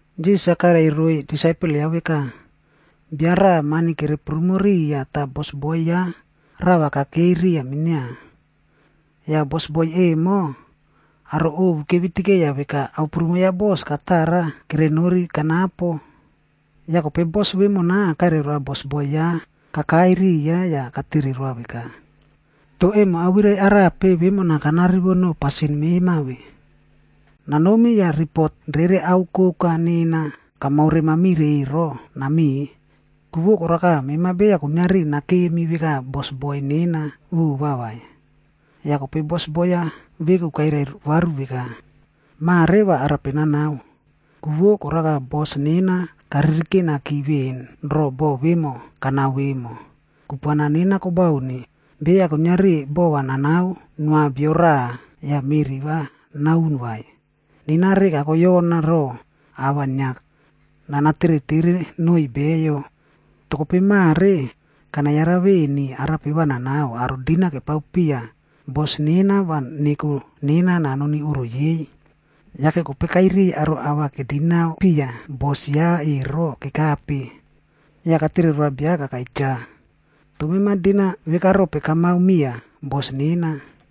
Jisas-a kairai roiy disaipel ya veka, “Bia raꞌa mani kere prumo riya tah bosboi ya rava kakei riya minia. Yah bosboi emo aro ovu kevitikeiya veka ao prumo ya bos, katara kere nori kanapo. Yah kope bos vemona, kairia bosboi ya kakai riya yah katere roa veka, ‘Toh emo awirai arape vemona kanarivo noꞌo pasin mema ve? Nanomi yah ripot rere ao koka nena kamaore mamire ero nameꞌe. Ku vo koraka, mema beya kuiniari nakemi veka bosboi nena vova vai.’ “Yah kope bosboi-a veku kairai varu veka, ‘Mare va arape nanao? Ku vo koraka bos nena karirikenaki veꞌen roꞌo boꞌo vemo kanao vemo. Kupuana nena kobauni, beya kuiniari bova nanao noa bio raꞌa yah meri va naun vai. Nena reka koyona roꞌo ava inia nana teretere noiy beyo. Toh kope mare, kana yara veni arape va nanao, aro dinau kepao piya bos nena va neko nena nanoni oꞌro yei.’ “Yake kope kairiy aro ava kedinau piya bos ya ero kekape. Yah katere roa bia kakai cha, ‘Toh mema dinau veka rope kamao miya bos nena?’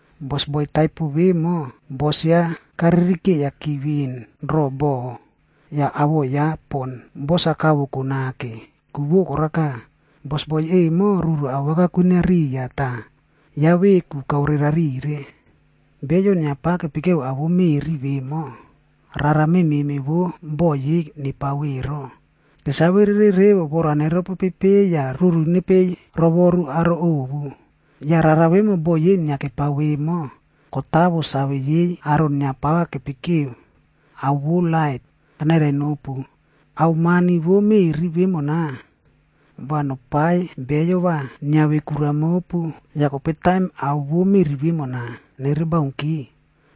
“Bosboi taipo vemo, bos ya karirikeiyaki veꞌen ro boꞌo, yah awoꞌo ya pon bos-a kavoko nake. Ku vo koraka, bosboi emo ruru awaka kwinia riya tah ya veku kaore rariya. Beyo inia pava kepikeo ao vo meri vemo, rara memeꞌme vo boꞌo yei nepao ero, kesave rere revo vora neropopei yah ruru nepei rovoru aro ovu. Yah rara vemo boꞌo yei inia kepao vemo, kotawo save yei aro inia pava kepikeo ao vo lait. Kanairai nopu, ao mani vo meꞌri vemona, va nopaiy beyo va niave kura mopu. Yah kope taim ao vo meꞌri vemona, nere baunki,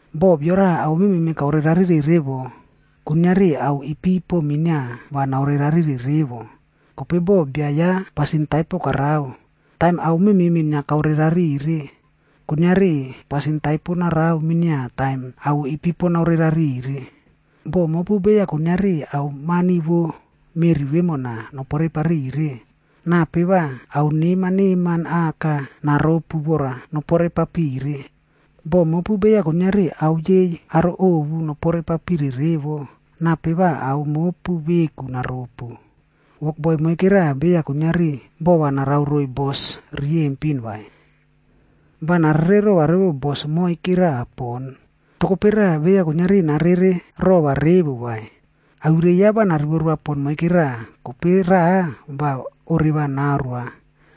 “Boh bio raꞌa ao memeꞌme kaore rarire revo, kuiniari ao ipipo minia va naore rarire revo. Kope boh bia ya pasin taipo karao, taim ao memeꞌme inia kaore rarire, kuiniari pasin taipo narao minia taim ao ipipo naore rarire. Boh mopu beya kuiniari ao mani vo meꞌri vemona nopore papire, nape va ao neman neman aka naropu vora nopore papire? Boh mopu beya kuiniari ao yei aro ovu nopore papire revo, nape va ao mopu veku naropu?” “Wokboi moike raꞌa beya kuiniari bova narao roiy bos riyempin vai. Va narererova revo bos moikeraꞌa pon, toh kope raꞌa beya kuiniari narererova revo vai. Awirai-a va narivo roa pon moike raꞌa, kope raꞌa va oreva naoroa.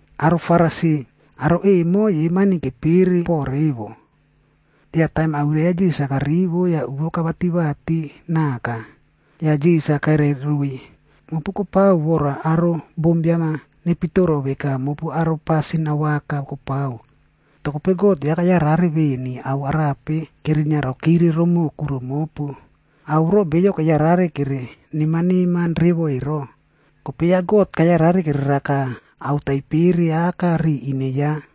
Aro Farisi, aro emo yei mani kepere poꞌo revo. Yah taim awirai ya Jisas-a kerivo, tah uvo kevati vati naka. Yah Jisas-a kairai roiy, “Mopu kopao vora aro bombiam-a nepitoro veka mopu aro pasin awaka kopao. Toh kope God, ya kayarare veni ao arape kerinia rokire romoꞌo kuro mopu. Ao voro beyo keyarare kere neman neman revo ero, kope ya God kayarare kereraka ao taipere aka ri ine ya.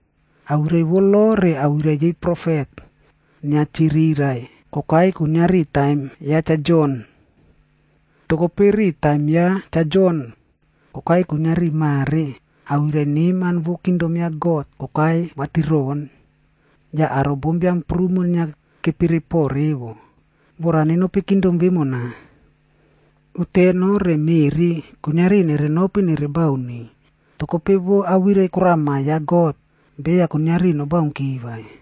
“Awirai vo lo re awirai yei profet, inia chirirai kokai kuiniari taim ya Cha Jon.e Toh kope, ri taim ya Cha Jon kokai kuiniari mare, awirai neman vo kingdom ya God kokai vatiroꞌon. Yah aro bombiam prumo inia kepere poꞌo revo, vora nenopi kingdom vemona. Uteno re meꞌri kuiniari nere nopi nere bauni, toh kope vo awirai korama ya God, beya kuiniari nobaunki vai.”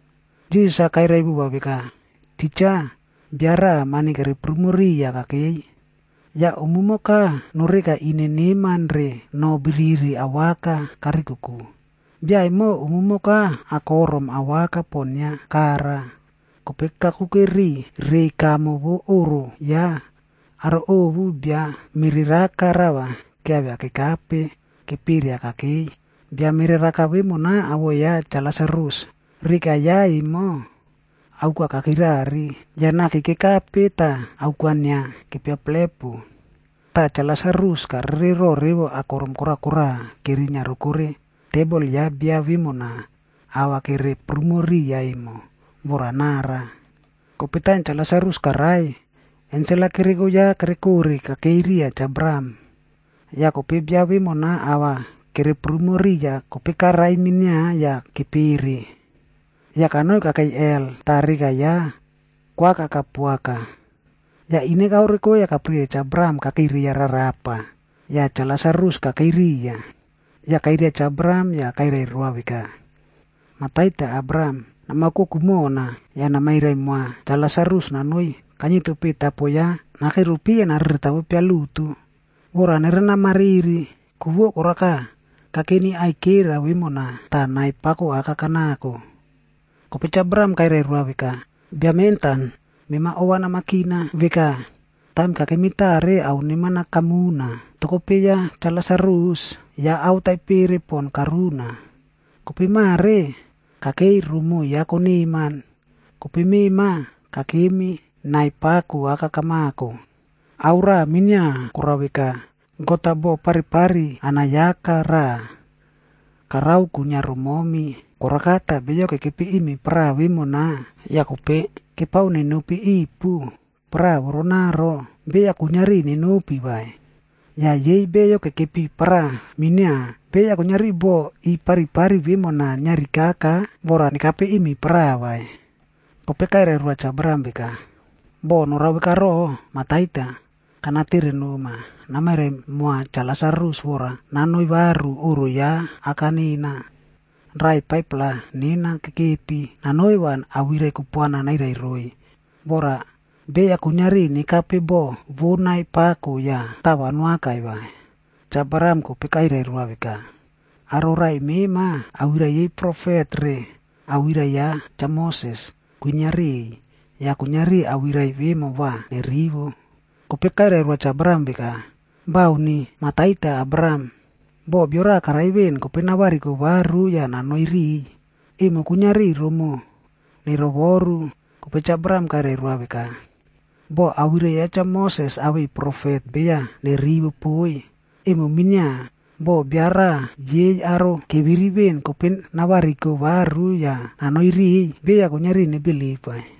Jisas-a kairai vova veka, “Titja, bia raꞌa mani kere prumo riya kakei. Yah umumoka noreka ine neman re noh biriri awaka karikoko. Bia emo umumoka akorom awaka pon inia kara. Kope kakuke ri reiy kamo vo oꞌro ya, aro ovu bia mereraka rava kiavia kekape keperia kakei.f Bia mereraka vemona awoꞌo ya Cha Lasarus. Reka ya emo, auka kakirari, yah naki kekape tah auka inia kepiaplepu. Tah Cha Lasarus karere roꞌo revo akorom kora kora kerinia rokore tebol ya bia vemona ava kere prumo riya emo, vora nara. “Kope taim Cha Lasarus karai, ensel-a kereko ya kere kore kakei riya Cha Abraham.g Yah kope bia vemona ava kere prumo riya kope karai minia yah kepere. Yah kanoi kakei helh tah reka ya koakaka poaka. Yah ine kaoreko yah kapirikeiya Cha Abraham kakei reiya rarapa, yah Cha Lasarus kakei riya. Yah kairia Cha Abraham yah kairai roa veka, ‘Mah Taita Abraham, nama oukoko mona, yah namairai moa Cha Lasarus nanoi kainieto peꞌe tapo ya nakero pi yah nere nareretavo pialutu, vora nerena marimariri. Ku vo koraka, kakeni aikera vemona, tah nai pako aka kanako.’ “Kope Abraham kairai roa veka, ‘Bia mentan, Mema ova namakina veka, taim kakemi tare, ao neman-a kamuna. Toh kope ya Cha Lasarus, ya ao taipere pon karuna. Kope mare, kakei romoꞌo ya koneman, kope mema kakemi nai pako aka kamako. Ao raꞌa minia korao veka, God-a bo paripari anayaka raꞌa karao kwinia romomi. Koraka tah beyo kekepi imi paraꞌa vemona yah kope kepao nenopi ipu paraꞌa voronaro, beya kuiniari nenopi vai. Yah yei beyo kekepi paraꞌa minia, beya kuiniari bo i paripari vemona niarikaka vora nekape imi paraꞌa vai. “Kope kairai roa Cha Abraham veka, ‘Boh norao vekaro, Mah taita, kana tere noma, namairai moa Cha Lasarus vora nanoi varu oꞌro ya aka nena. Raꞌai 5-pla nena kekepi. Nanoi va awirai kupuana nairai roiy, vora beya kuiniari nekape bo vo nai pako yah tava noakai vai.’ “Cha Abraham kope kairai roa veka, ‘Aro raꞌai mema, awirai yei profet re awirai ya Cha Mosesi kwinia riꞌiy. Yah kuiniari awirai vemo va nerivo.’ “Kope kairai roa Cha Abraham veka, ‘Bauni! Mah Taita Abraham, boh bio raꞌa karai veꞌen, kope navariko varu yah nanoi riꞌiy, emo kuiniari romoꞌo nerovoru.’ “Kope Cha Abraham kairai roa veka, ‘Boh awirai ya Cha Moses awei profet beya nerivo poiy, emo minia, boh bia raꞌa yei aro keviri veꞌen kope navariko varu yah nanoi riꞌiy, beya kuiniari nebilip vai.’”